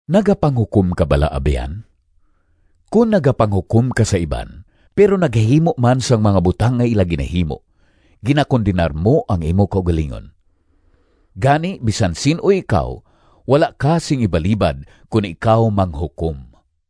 Nagapanghukom ka bala, abyan? Kon nagapanghukom ka sa iban, pero nagahimo man sang mga butang nga ila ginahimo, ginakondenar mo ang imo kaugalingon. Gani bisan sin-o ikaw, wala ka sing ibalibad kon ikaw manghukom.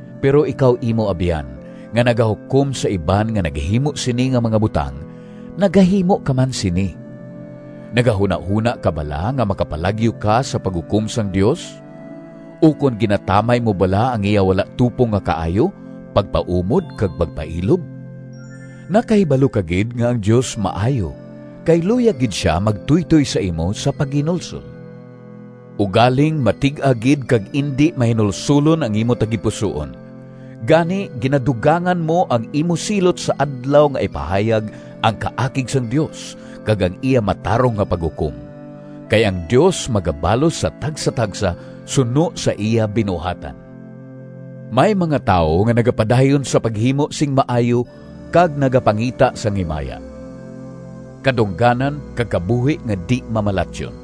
Pero, ikaw imo abyan, nga nagahukom sa iban nga nagahimo sini nga mga butang, nagahimo ka man sini! Nagahunahona ka bala nga makapalagyo ka sa paghukom sang Dios? Ukon ginatamay mo bala ang iya wala tupong nga kaayo, pagpaumod kag pagpailob? Nakahibalo ka gid nga ang Dios maayo, kay luyag gid sia magtuytoy sa imo sa paghinulsol! Ugaling matig-a gid kag indi mahinulsolon ang imo tagipusoon. Gani, ginadugangan mo ang imo silot sa Adlaw nga ipahayag ang kaakig sang Dios kag ang iya matarong nga paghukom. Kay ang Dios magabalos sa tagsatagsa suno sa iya binuhatan. May mga tawo nga nagapadayon sa paghimo sing maayo kag nagapangita sang himaya, kadungganan kag kabuhi nga di-mamalatyon.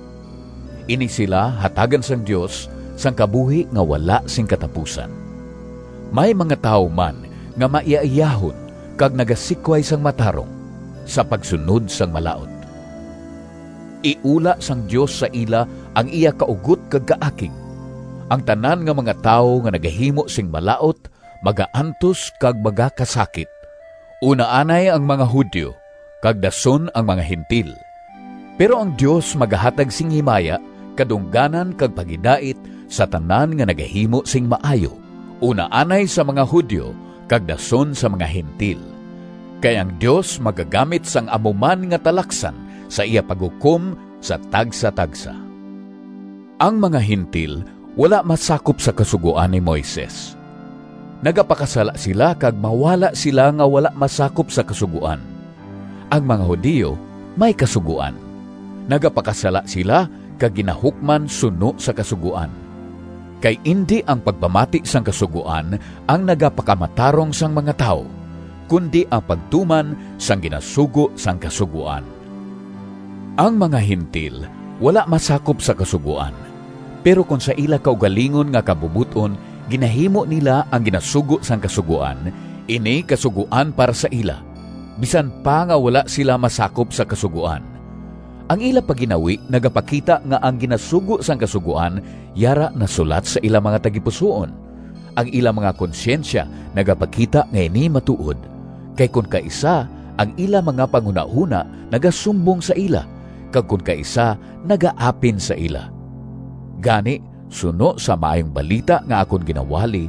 Ini sila hatagan sang Dios sang kabuhi nga wala sing katapusan. May mga tawo man nga maiyaiyahon kag nagasikway sang matarong sa pagsunod sang malaut. Iula sang Dios sa ila ang iya kaugot kag kaakig. Ang tanan nga mga tawo nga nagahimo sing malaut magaantos kag magakasakit, una anay ang mga Judio kag dason ang mga Gentil. Pero ang Dios magahatag sing himaya, kadungganan kag paghidait sa tanan nga nagahimo sing maayo, una anay sa mga Judio kag dason sa mga Gentil. Kay ang Dios magagamit sang amo man nga talaksan sa iya paghukom sa tagsatagsa. Ang mga Gentil wala masakop sa Kasugoan ni Moises. Nagapakasala sila kag mawala sila nga wala masakop sa Kasugoan. Ang mga Judio may Kasugoan. Nagapakasala sila kag ginahukman suno sa Kasugoan. Kay indi ang pagpamati sang Kasugoan ang nagapakamatarong sang mga tawo, kundi ang pagtuman sang ginasugo sang Kasugoan. Ang mga Gentil wala masakop sa Kasugoan; pero kon sa ila kaugalingon nga kabubot-on ginahimo nila ang ginasugo sang Kasugoan, ini kasugoan para sa ila, bisan pa nga wala sila masakop sa Kasugoan. Ang ila pagginawi nagapakita nga ang ginasugo sang Kasugoan yara nasulat sa ila mga tagipusoon. Ang ila mga konsyensya nagapakita nga ini matuod, kay kon kaisa ang ila mga panghunahona nagasumbong sa ila, kag kon kaisa nagaapin sa ila. Gani, suno sa Maayong Balita nga akon ginawali,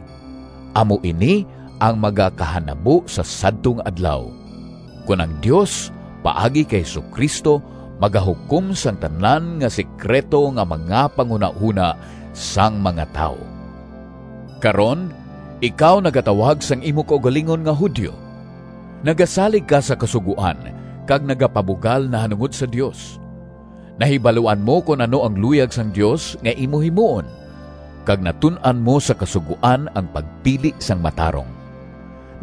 amo ini ang magakahanabo sa sadto nga Adlaw, kon ang Dios, paagi kay Jesu-Cristo, magahukom sang tanan nga sekrito nga mga panghunahona sang mga tawo. Karon, ikaw nagatawag sang imo kaugalingon nga Judio; nagasalig ka sa Kasugoan kag nagapabugal nahanungod sa Dios; nahibaluan mo kon ano ang luyag sang Dios nga imo himuon, kag natun-an mo sa Kasugoan ang pagpili sang matarong.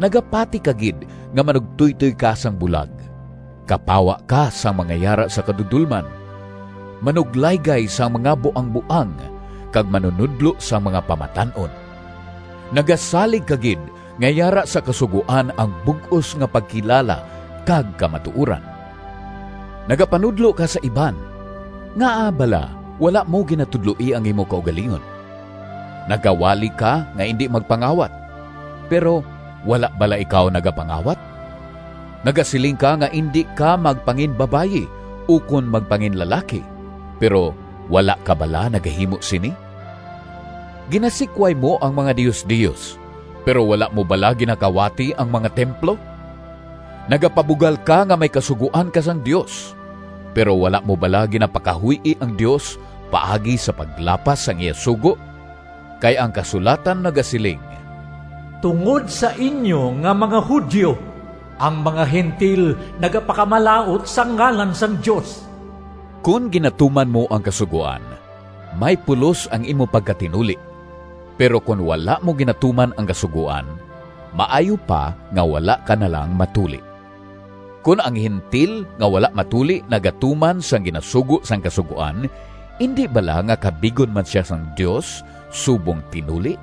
Nagapati ka gid nga manugtoytoy ka sang bulag, kapawa ka sang mga yara sa kadudolman, manuglaygay sang mga buangboang kag manunodlo sang mga pamatan-on. Nagasalig ka gid nga yara sa Kasugoan ang bug-os nga pagkilala kag kamatuoran. Nagapanudlo ka sa iban—ngaa bala wala mo ginatudloi ang imo kaugalingon? Nagawali ka nga indi magpangawat, pero wala bala ikaw nagapangawat? Nagasiling ka nga indi ka magpanginbabayi ukon magpanginlalaki, pero wala ka bala nagahimo sini? Ginasikway mo ang mga diosdios, pero wala mo bala ginakawati ang mga templo? Nagapabugal ka nga may kasugoan ka sang Dios, pero wala mo bala ginapakahuy-i ang Dios paagi sa paglapas sang iya sugo? Kay ang kasulatan nagasiling, “Tungod sa inyo nga mga Judio, ang mga Gentil nagapakamalaut sang ngalan sang Dios.” Kon ginatuman mo ang Kasugoan, may pulos ang imo pagkatinuli, pero kon wala mo ginatuman ang Kasugoan, maayo pa nga wala ka na lang matuli. Kon ang Gentil nga wala matuli nagatuman sang ginasugo sang Kasugoan, indi bala nga kabigon man sia sang Dios subong tinuli?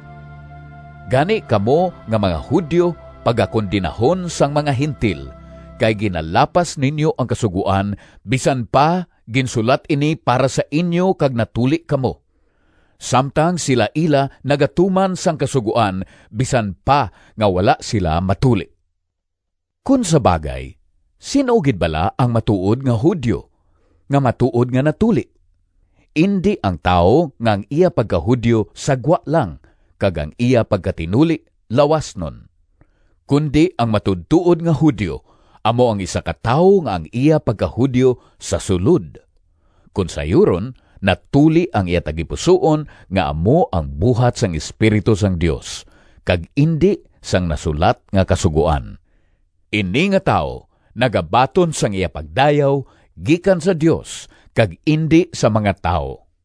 Gani kamo nga mga Judio pagakondenahon sang mga Gentil, kay ginalapas ninyo ang Kasugoan, bisan pa ginsulat ini para sa inyo kag natuli kamo, samtang sila ila nagatuman sang Kasugoan bisan pa nga wala sila matuli. Kon sa bagay sin-o gid bala ang matuod nga Judio nga matuod nga natuli? Indi ang tawo nga ang iya pagka-Judio sa gwa lang kag ang iya pagkatinuli lawasnon, kundi ang matuodtuod nga Judio amo ang isa ka tawo nga ang iya pagka-Judio sa sulod, kon sayuron, natuli ang iya tagipusoon nga amo ang buhat sang Espiritu sang Dios, kag indi sang nasulat nga Kasugoan. Ini nga tawo nagabaton sang iya pagdayaw gikan sa Dios kag indi sa mga tawo.